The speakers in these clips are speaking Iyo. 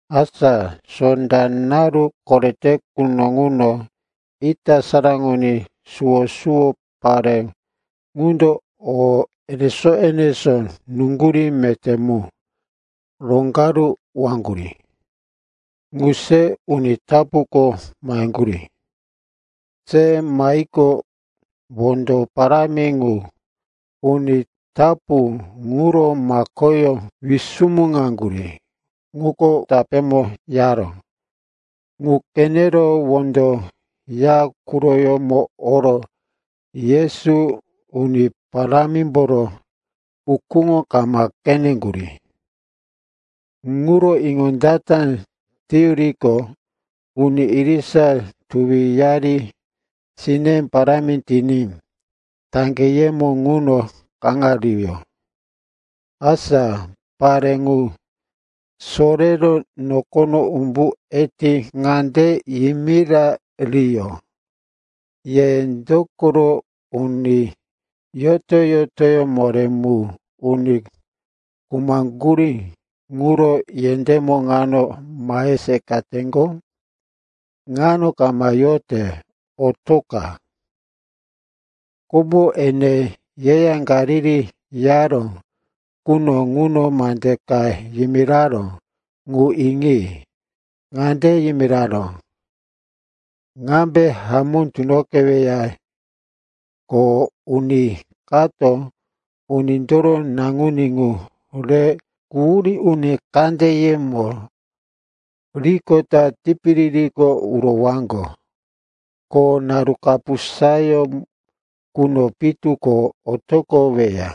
Asa sonda naru korete quno ŋuno ita saraŋoní suwo-suwo, pare ŋundo o enesó-enesó nuŋgurí meté mu roŋgaruwaŋgurí ŋu se uni tapuko maheŋgurí. Se mahiqo, wondo parámi ŋu uni tapu ŋuro makoyó wisumuŋaŋgurí, ŋuko tapémo yaró. Ŋu qenero wondo ya quroyómo oro Yesu Uni Parámimboro ukúŋo kama qeneŋgurí. Ŋuro iŋondata teyuriqo, uni irisa tuwiyari sine parámi tiní taŋgeyemo ŋuno kaŋariyó. Asa pare ŋu sorero nokono umbu eti ŋande yimirariyó, “Ye dokoro uni yoto-yotoyó moré mu uni khumaŋgurí ŋuro yendémo ŋano mahe seqateŋgo? Ŋano kama yote; otoqa! Komo ene yeya Galili yaró quno ŋuno mande ka yimiraró. Ŋu iŋi. Ŋande yimiraró, ‘Ŋambe hamó tunoqeweya, ko uni kato Unindoro Naŋuní ŋu rero quhurí uni kandeyemo riqota tipiririko urowaŋgo. Ko naru kapusa quno pitu ko otoqoweya.’”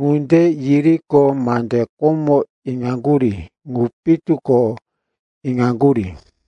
Ŋunde yiriqo, mande komo iŋaŋgurí ŋu pitu ko iŋaŋgurí.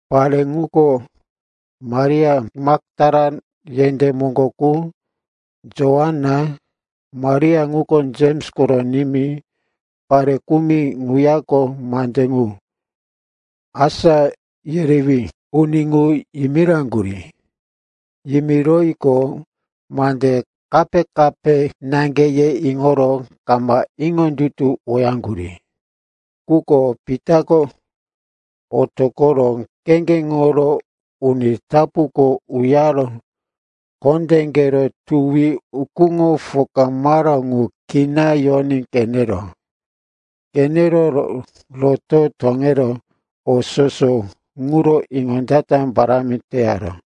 Pare ŋuko Maria Maktala yendé moŋgo qu, Joana, Maria ŋuko Jems koro nimí, pare kumi ŋuyako mande ŋu asá yerewí uni ŋu yimiraŋgurí. Yimiroyiqo, mande kape-kape naŋge, ye iŋoro kama iŋondutuwoyaŋgurí. Quko Pitako otoqoro kheŋgeŋoro uni tapuko uyaro kondéqero tuwi ukúŋo pokamaró ŋu kina yoní qeneró. Qenero roto toŋero o soso ŋuro iŋondata parámi teyaró.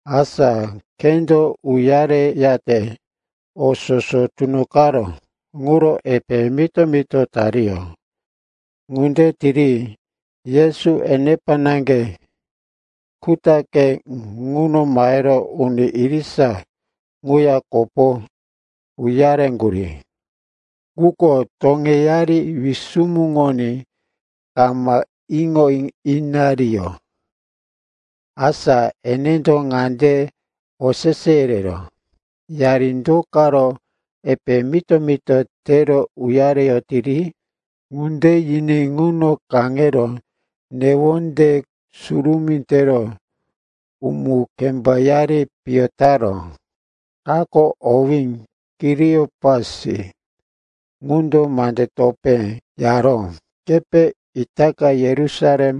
Asa khendo uyareyate o soso tunoqaró ŋuro epe mito-mito tariyó. Ŋunde tiri Yesu enepa naŋge kutaqe ŋuno mahero uni irisa ŋuya kopo uyareŋgurí. Quko toŋeyari wisumuŋoní kama iŋo inariyó. Asa enendo ŋande osese yereró, “Yari do karo epe mito-mito tero uyareyotiri?” Ŋunde yiní ŋuno kaŋero newonde surumí tero umu-kembayari piyo taró. Kako, owí Kiliopasi, ŋundo mande topé yaró, “Kepe itaka Yerusalem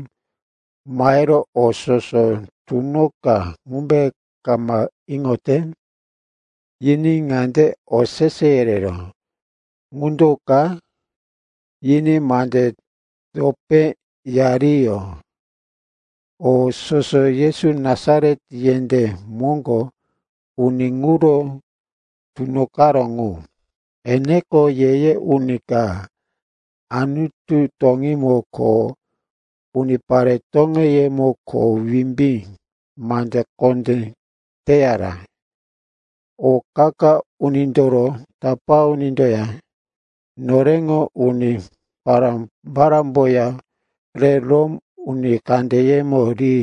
mahero o soso tunoqa ŋumbe kama iŋote?” Yiní ŋande osese yereró, “Ŋu do ka?” Yiní mande topé yariyó, “O soso Yesu Nasaret yendé moŋgo uni ŋuro tunoqaró ŋu. Eneko ye-ye uni ka, Anutu toŋímo ko unipare toŋeyemo kho wimbí, mande kondé teyara. O qa-qa unindoro tapá unindoya noreŋo uni pará-parámboya re Rom uni kandeyemo ri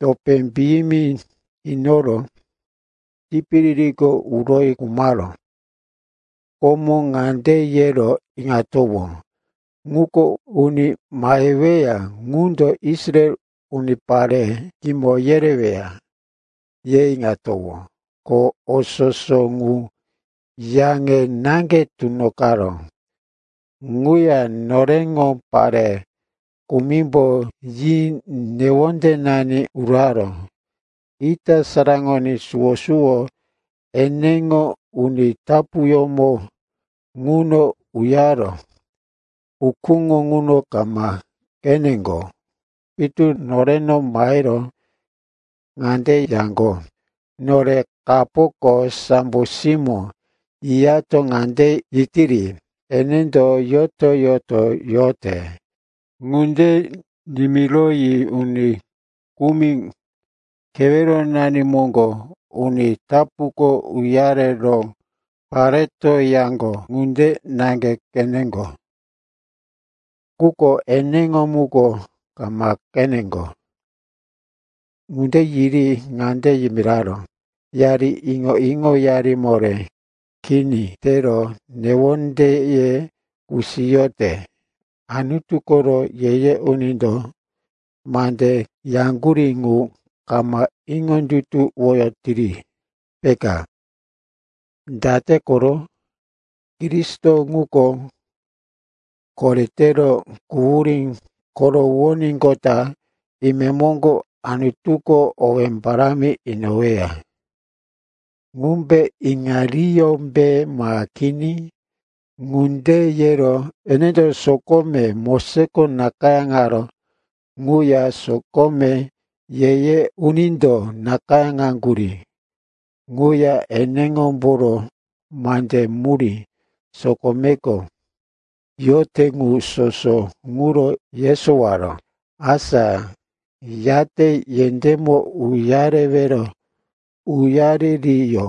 topé piyimi inoro tipiririko uroyi khumaró. Komo ŋande yero iŋatowó, ŋuko uni maheweya ŋundo Israel unipare kimo yereweya, ye iŋatowó. Ko o soso ŋu yaŋe naŋge tunoqaró. Ŋuya noreŋo pare kumimbo yi newondenani uraró. Ita saraŋoní suwo-suwo eneŋo uni tapuyómo ŋuno uyaro ukúŋo ŋuno kama qeneŋgo. Pitu noreno mahero ŋande yaŋgo, ‘Nore kapoko sambo simó yiyato ŋande yetiri, “Enendo yoto-yoto yote.”’ Ŋunde nimiroyi uni kumi keweronani moŋgo uni tapuko uyaro pareto yaŋgo ŋunde naŋge qeneŋgo. Quko eneŋo muko kama qeneŋgo.” Ŋunde yiri ŋande yimiraró, “Yari iŋo-iŋoyari moré kini tero newondeye kusiyote. Anutu koro ye-ye unindo mande yaŋgurí ŋu kama iŋondutuwoyotiri, peka. Date koro? Kristo ŋuko koretero quhurí korowoníqota, imemoŋgo Anutuko owé parámi inoweya. Ŋumbe iŋariyómbe ma kini?” Ŋunde yero enendo sokome Mosesko nakayáŋaró quya sokome Ye-ye Unindo nakayáŋaŋgurí quya eneŋomboro mande murí sokomeko yote ŋu soso ŋuro yesowaró. Asa yate yendémo uyarewero uyaririyó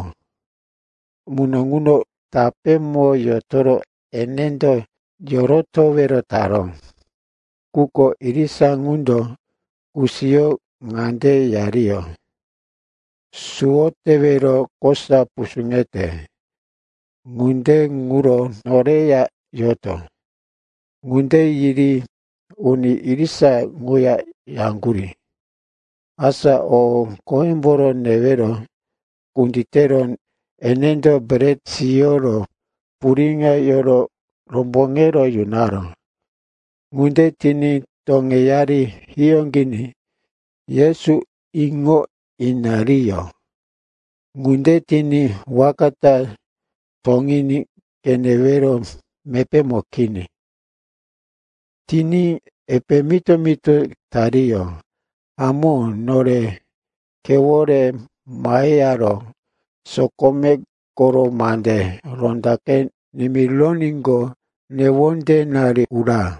muno ŋuno tapémo yotoro enendo yorotowero taró. Quko irisa ŋundo kusiyoro ŋande yariyó, “Suwo tewero kosa pusuŋete. Ŋunde ŋuro noreya yoto.” Ŋunde yiri uni irisa ŋuya yaŋgurí. Asa o qoyemboro newero kunditero enendo bret siyoro puriŋo yero romboŋero yunaró. Ŋunde tiní, toŋeyari hiyóqiní, Yesu iŋo inariyó. Ŋunde tiní waka ta toŋiní qenewero mepémo kini. Tiní epe mito-mito tariyó, “Hamó, nore khewore maheyaro sokome koro mande rondaqe nimironíqo, newondenari ura!”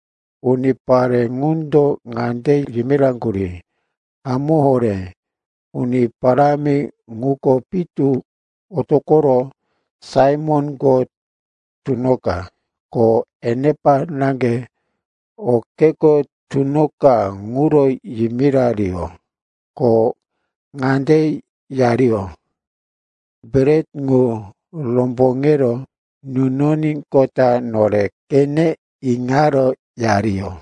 Unipare ŋundo ŋande yimiraŋgurí, “Hamó horé, Uni Parámi ŋuko pitu otoqoro Saimonko tunoqa!” Ko enepa naŋge o kheko tunoqa ŋuro yimirariyó. Ko ŋande yariyó, “Bret ŋu romboŋe nunoníqota nore qene iŋaro,” yariyó.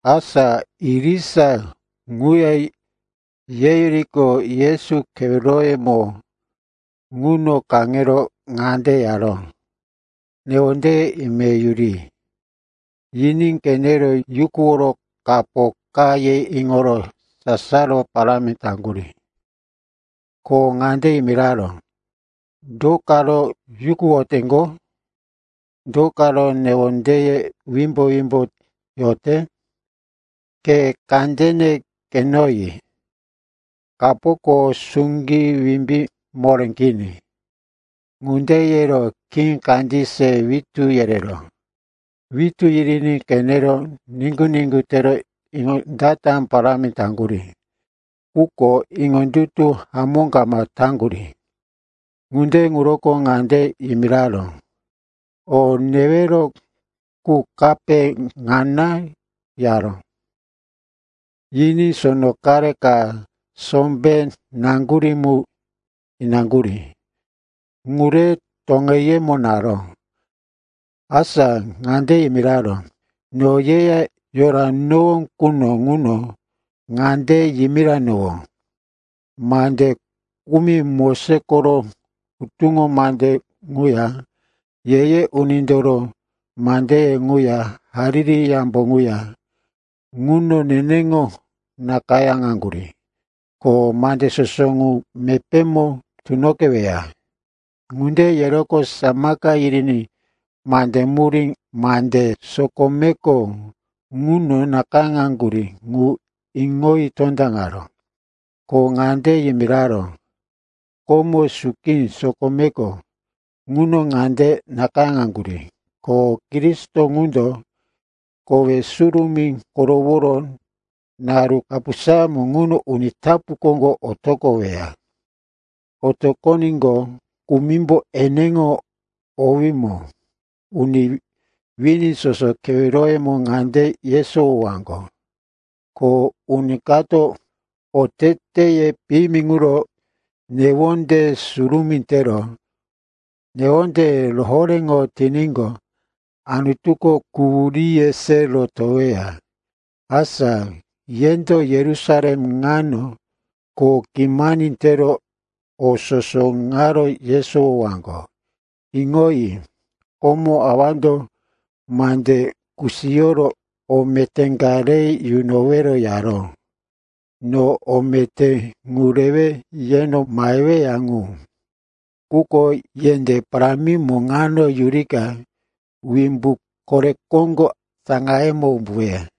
Asa irisa ŋuya yeyuriqo, Yesu keweroyemo ŋuno kaŋero ŋande yaró, “Newonde ime yuri.” Yiní qenero yukuworo, kapo ka, ye iŋoro sasaro parámi taŋgurí. Ko ŋande yimiraró, “Do karo yukuwoteŋgo? Do karo newondeye wimbo-wimbo yote? Khe kandene qenoyi. Kapoko suŋgí, wimbí moré kini.” Ŋunde yero khí kandí se witú yereró. Witú yiriní qenero niŋgu-niŋgu tero iŋondata parámi taŋgurí, quko iŋondutu hamó kama taŋgurí. Ŋunde ŋuroko ŋande yimiraró, “O newero qu kape ŋana?” yaró. Yiní sono qare ka sombé qaŋgurí mu inaŋgurí. Ŋu re toŋeyemo naró. Asa ŋande yimiraró, “No yeya yoranowó quno ŋuno ŋande yimiranowó: mande kumi Moses koro Hutuŋo Mande ŋuya Ye-ye Unindoro mandeye ŋuya Hariri Yambo ŋuya ŋuno neneŋo nakayáŋaŋgurí, ko mande soso ŋu mepémo tunoqeweya.” Ŋunde yeroqo samaka yiriní mande murí mande sokomeko ŋuno nakayáŋaŋgurí ŋu iŋoyi tondaŋaró. Ko ŋande yimiraró, “Komo suki sokomeko ŋuno ŋande nakayáŋaŋgurí, ko Kristo ŋundo kowe surumí koroworo naru kapusayómo ŋuno uni tapu koŋgo otoqoweya. Otoqoníqo, kumimbo eneŋo owímo uni wini soso keweroyemo ŋande yesowowaŋgo, ko uni kato oteteye piyimi ŋuro newonde surumí tero newonde rohoréŋo tiníqo, Anutuko quhuríye se rotoweya. Asa yendo Yerusalem ŋano kho kimani tero o soso ŋaro yesowowaŋgo. Iŋoyi. Komo Awando mande kusiyoro o meté ka re yunowero yaró. No o meté ŋu rewe yeno maheweya ŋu. Quko yendé parámimo ŋano yurika wimbu kore koŋgo saŋayemo umbuweya.”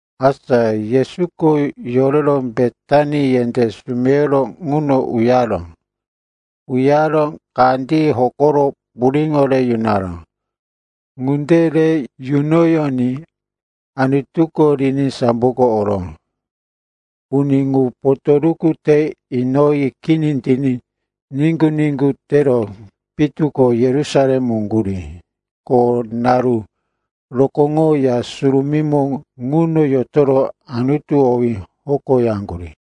Asa Yesuko yorero Betani yendé sumeyoro ŋuno uyaró. Uyaro kandí hokoro puriŋo re yunaró. Ŋunde re yunoyoní Anutuko riní samboko oró. Uni ŋu potoruku te inoyi kini tiní niŋgu-niŋgu tero pitu ko Yerusalem uŋgurí. Ko naru rokóŋo Ya Surumímo ŋuno yotoro Anutu owí hokoyaŋgurí.